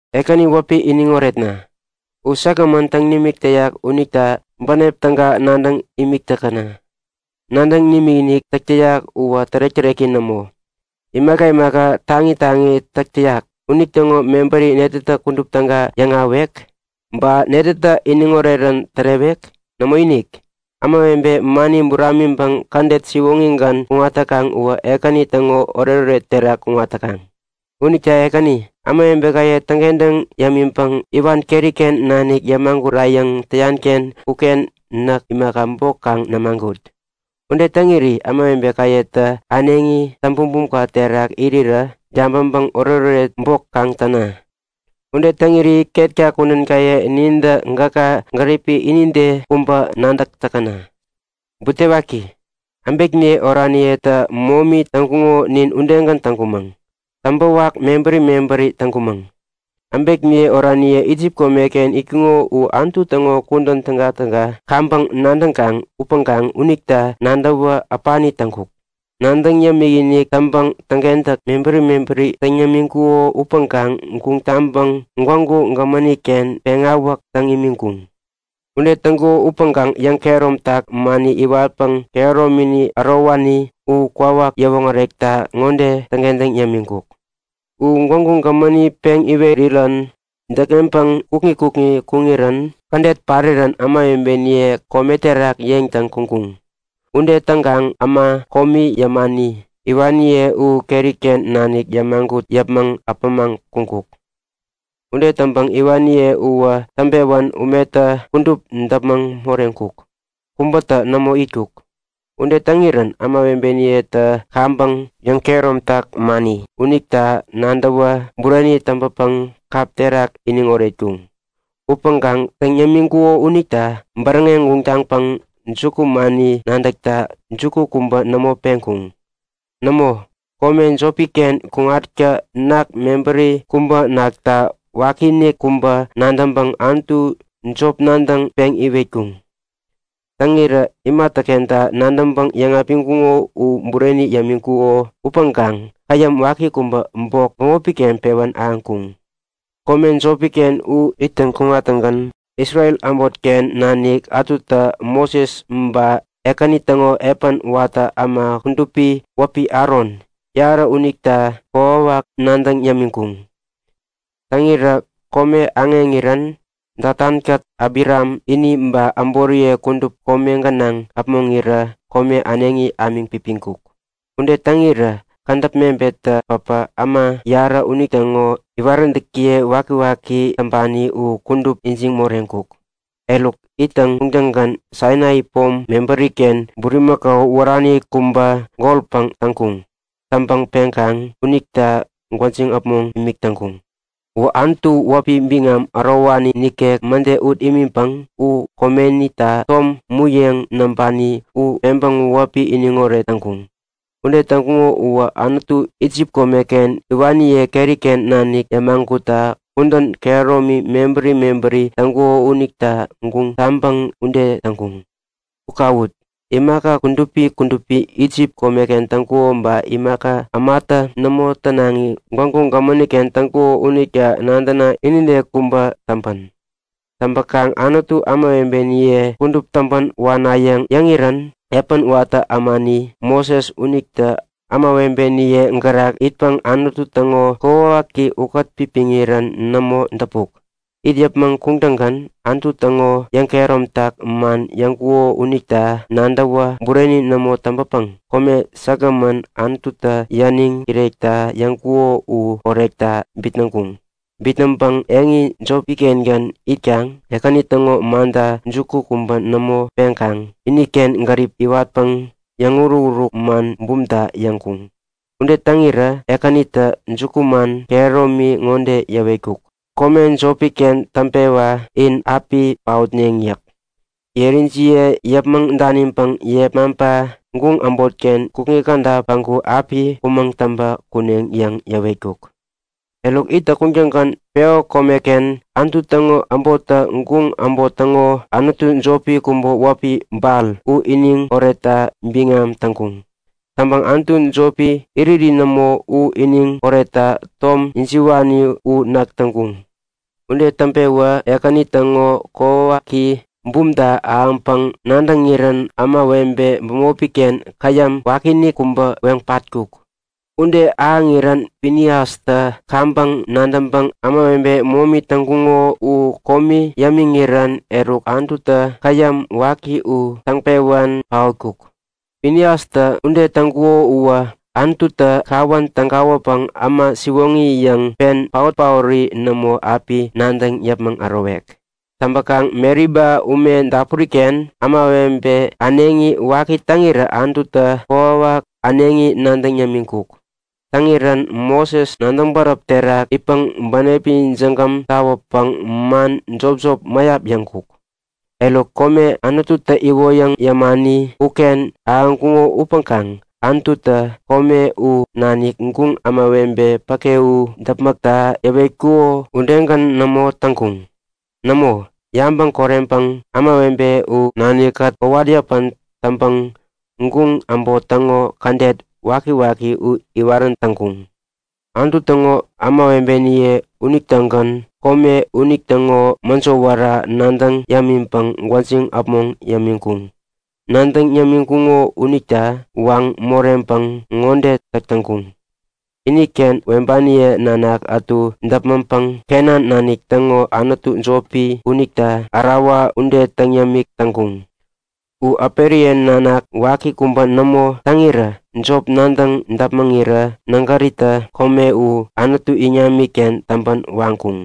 Ekäni wäpi iniŋ oretna! U säkgämän täŋ nimik täyak unita bänep täga nadäŋ imik täkäna! Nadäŋ nimikinik täk täyak uwä tärek-täreki nämo. Imaka imaka taŋi taŋi täk täyak unitäŋo mebäri netätä kudup täga yäŋahäwek? Ba netätä iniŋ orerän tärewek? Nämoinik! Ämawebe mani buramiŋpäŋ kädet siwoŋigän kuŋat täkaŋ uwä Ekäni täŋo oretoret terak kuŋat täkaŋ. Unita Ekäni, ämawebekaye täŋkentäŋ yämiŋpäŋ iwan keriken nanik yämagurayäŋ täyanken uken näk imaka, bok kaŋ nimagut! Ude täŋiri ämawebekayetä äneŋi täŋ-bumbum terak irirä yabäŋpäŋ oretoret bok kaŋ täna. Ude täŋiri ketka kudänkaye nintä gäka gäripi inide kubä nadäk täkäna! Butewaki, äbekniye oraniyetä momi täŋkuŋo nin udegän täŋkumäŋ. Täŋpäwak mebäri mebäri täŋkumäŋ. Äbekniye oraniye Isip komeken itkuŋo u Anutu täŋo kudän tägatäga kaŋpäŋ nadäŋkaŋ upäŋkaŋ unita nadäwä äpani täŋkuk. Nadäŋ yämik-inik täŋpäŋ täŋkentäk mebäri mebäri täŋ yämiŋkuko upäŋkaŋ guŋ taŋpäŋ Gwägu Gämäniken peŋawäk täŋ imiŋkuŋ. Ude täŋkuŋo upäŋkaŋ yäŋkehäromtak mani iwatpäŋ kehäromini ärowani u kwawak yäwoŋärekta ŋode täŋkentäŋ yämiŋkuk; U Gwägu Gämäni peŋ iwerirän däkŋeŋpäŋ kukŋi kukŋi kuŋirän kädet parirän ämawebeniye kome terak yeŋtäŋ kuŋkuŋ. Ude täŋkaŋ äma komi yämani, iwaniye u keriken nanik yämagut yäpmäŋ äpämaŋ kuŋkuk. Ude täŋpäŋ iwaniye uwä täŋpewän umetä kudup däpmäŋ moreŋkuk, kubätä nämo itkuk. Ude täŋirän ämawebeniyetä kaŋpäŋ yäŋkehäromtak mani unita nadäwä bureni täŋpäpäŋ kap terak iniŋ oretkuŋ. Upäŋkaŋ täŋ yämiŋkuko unita bäräŋeŋ guŋ taŋpäŋ jukumani nadäkta juku kubä nämo peŋkuŋ. Nämo, kome jopiken kuŋatkä ketem mebäri kubä nakta wakiinik kubä nadäŋpäŋ Anutu jop nadäŋ peŋ iwetkuŋ. Täŋirä imatäkenta nadäŋpäŋ yäŋapiŋkuŋo u bureni yämiŋkuko upäŋkaŋ käyäm waki kubä bok bämopiken pewän ahäŋkuŋ. Kome jopiken u ittäŋ kuŋattäŋgän Isrel äbotken nanik ätutä Moses ba Ekäni täŋo epän watä äma kudupi wäpi Aron, yarä unita kokwawak nadäŋ yämiŋkuŋ. Täŋirä kome aŋeŋirän Datankät Abiram ini ba äboriye kudup kome gänaŋ äpmoŋirä kome äneŋi ämiŋ pipiŋkuk. Ude täŋirä kädäp mebettä päpä äma yarä unitäŋo iwaräntäkiye wakiwaki täŋpani u kudup ijiŋ moreŋkuk. Eruk, ittäŋ kuŋtäŋgän Sainai pom mebäriken bulimakau wärani kubä golpäŋ täŋpani täŋkuŋ. Täŋpäŋ peŋkaŋ unita gwäjiŋ äpmoŋ imik täŋkuŋ. U Anutu wäpi biŋam ärowani nikek mäde ut imiŋpäŋ u komenita tom muyeŋ näŋpani u peŋpäŋ wäpi iniŋoret täŋkuŋ. Ude täŋkuŋo uwä Anutu Isip komeken iwaniye keriken nanik yämagutta kudän kehäromi mebäri mebäri täŋkuko unita guŋ taŋpäŋ ude täŋkuŋ. U kawut! Imaka kudupi kudupi Isip kome täŋkuko ba imaka ämatä nämo tänaŋi Gwägu Gämäniken täŋkuko unita nadäna inide kubä täŋpän! Täŋpäkaŋ Anutu ämawebeniye kudup täŋpän wanayäŋ yäŋirän epän watä ämani Moses unitä ämawebeniye gärak itpäŋ Anutu täŋo kokwawaki ukät-pipiŋirän nämo däpuk. It yäpmäŋ kuŋtäŋgän Anutu täŋo yäŋkehäromtak man yäŋkuko unita nadäwä bureni nämo täŋpäpäŋ kome säkgämän Anututä yäniŋ kirekta yäŋkuko u korekta bitnäŋkuŋ. Bitnäŋpäŋ eŋi jopikengän itkaŋ Ekäni täŋo manta juku kubä nämo peŋkaŋ iniken gärip iwatpäŋ yäŋuruk-uruk man bumta yäŋkuŋ. Ude täŋirä Ekänitä jukuman kehäromi ŋode yäwetkuk; Kome jopiken täŋpewa in api paotneŋ yäk. Yerijiye yäpmäŋ daniŋpäŋ yepmaŋpa guŋ äbotken kukŋi käda päŋku api kumäŋ täŋpä kuneŋ yäŋ yäwetkuk. Eruk ittäŋ kuŋtäŋgän Peo komeken Anutu täŋo äbottä guŋ äbot täŋo anutu jopi kubä wäpi Bal u iniŋ oretta biŋam täŋkuŋ. Täŋpäŋ anutu jopi, iriri nämo, u iniŋ oretta tom ijiwani u nak täŋkuŋ. Ude täŋpewä Ekäni täŋo kokwawaki bumta ahäwänpäŋ nadäŋirän ämawebe bämopiken käyäm wakiinik kubä weŋ patkuk. Ude ahäŋirän Finiastä kaŋpäŋ nadäŋpäŋ ämawebe momi täŋkuŋo u komi yämiŋirän eruk Anututä käyäm waki u täŋpewän paotkuk. Finiastä ude täŋkuko uwä Anututä kawän tägawäpäŋ äma siwoŋi yäŋ pen, paot-paori nämo api nadäŋ yäpmäŋ ärowek. Täŋpäkaŋ Meriba ume dapuriken ämawebe äneŋi waki täŋirä Anututä kokwawak äneŋi nadäŋ yämiŋkuk. Täŋirän Moses nadäŋ bäräp terak itpäŋ bänepi jägäm tawäpäŋ man jopjop mäyap yäŋkuk. Eruk kome Anututä iwoyäŋ yämani uken ahäŋkuŋo upäŋkaŋ Anututä kome u nanik guŋ ämawebe päke u däpmäkta yäwetkuko udegän nämo täŋkuŋ. Nämo, yabäŋ koreŋpäŋ ämawebe u nanikkät kowat-yäpän täŋpäŋ guŋ äbot täŋo kädet wakiwaki u iwarän täŋkuŋ. Anutu täŋo ämawebeniye unitägän kome unitäŋo mäjo wära nadäŋ yämiŋpäŋ gwäjiŋ äpmoŋ yämiŋkuŋ. Nadäŋ yämiŋkuŋo unita waŋ moreŋpäŋ ŋode täk täŋkuŋ; Iniken äperiye nanak ätu däpmäŋpäŋ Kenan nanik täŋo anutu jopi unita ärawa ude täŋ yämik täŋkuŋ. U äperiye nanak waki kubä nämo täŋirä jop nadäŋ däpmäŋirä nägäritä kome u Anutu iŋamiken täŋpän waŋkuŋ.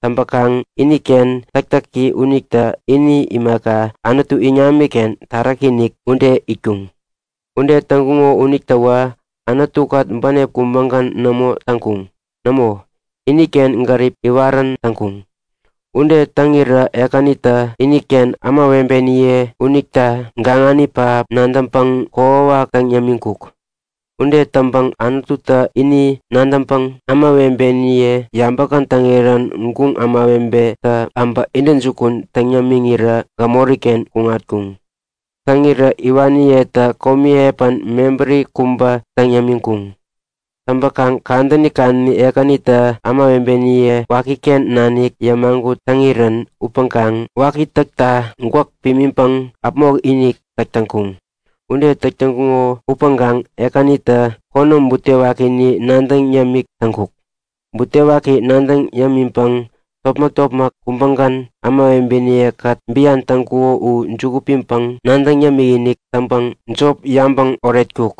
Täŋpäkaŋ iniken täktäki unitä ini imaka, Anutu iŋamiken taräki-inik ude itkuŋ. Ude täŋkuŋo unitäwä Anutukät bänep kubägän nämo täŋkuŋ. Nämo, iniken gärip iwarän täŋkuŋ. Ude täŋirä Ekänitä iniken ämawebeniye unita gaŋani pähap nadäŋpäŋ kokwawak täŋ yämiŋkuk. Ude täŋpäŋ Anututä ini nadäŋpäŋ ämawebeniye yabä-kätäŋirän guŋ ämawebetä äbä intäjukun täŋ yämiŋirä gämoriken kuŋatkuŋ. Täŋirä iwaniyetä komi epän mebäri kubä täŋ yämiŋkuŋ. Täŋpäkaŋ kadäni kadäni Ekänitä ämawebeniye wakiken nanik yämagut täŋirän upäŋkaŋ waki täkta gwäk pimiŋpäŋ äpmok-inik täk täŋkuŋ. Ude täk täŋkuŋo upäŋkaŋ Ekänitä konäm butewakini nadäŋ yämik täŋkuk. Butewaki nadäŋ yämiŋpäŋ topmäk-topmäk kubägän ämawebeniyekät bian täŋkuko u juku piŋpäŋ nadäŋ yämik-inik täŋpäŋ jop yabäŋ oretkuk.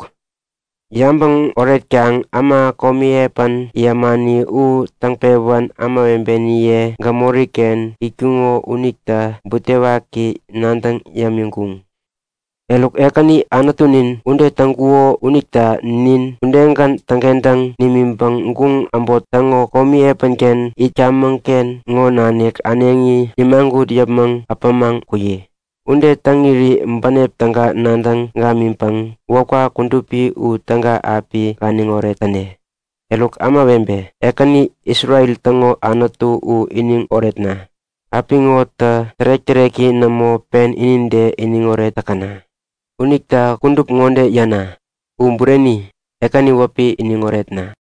Yabäŋ oretkaŋ äma komi epän yämani u täŋpewän ämawebeniye gämoriken itkuŋo unita butewaki nadäŋ yämiŋkuŋ. Eruk Ekäni Anutunin, ude täŋkuno unita nin udegän täŋkentäŋ nimiŋpäŋ guŋ äbot täŋo komi epänken itkamäŋken ŋo nanik äneŋi nimagut yäpmäŋ äpämaŋ kuyi! Ude täŋiri bänep täga nadäŋ gamiŋpäŋ wäpka kudupi u täga api ganiŋoret täne. Eruk ämawebe, Ekäni, Isrel täŋo Anutu u iniŋ oretna! Apiŋotä tärek-täreki nämo pen inide iniŋoret täkäna! Unita kudup ŋode yäna; U Bureni. Ekäni wäpi iniŋ oretna!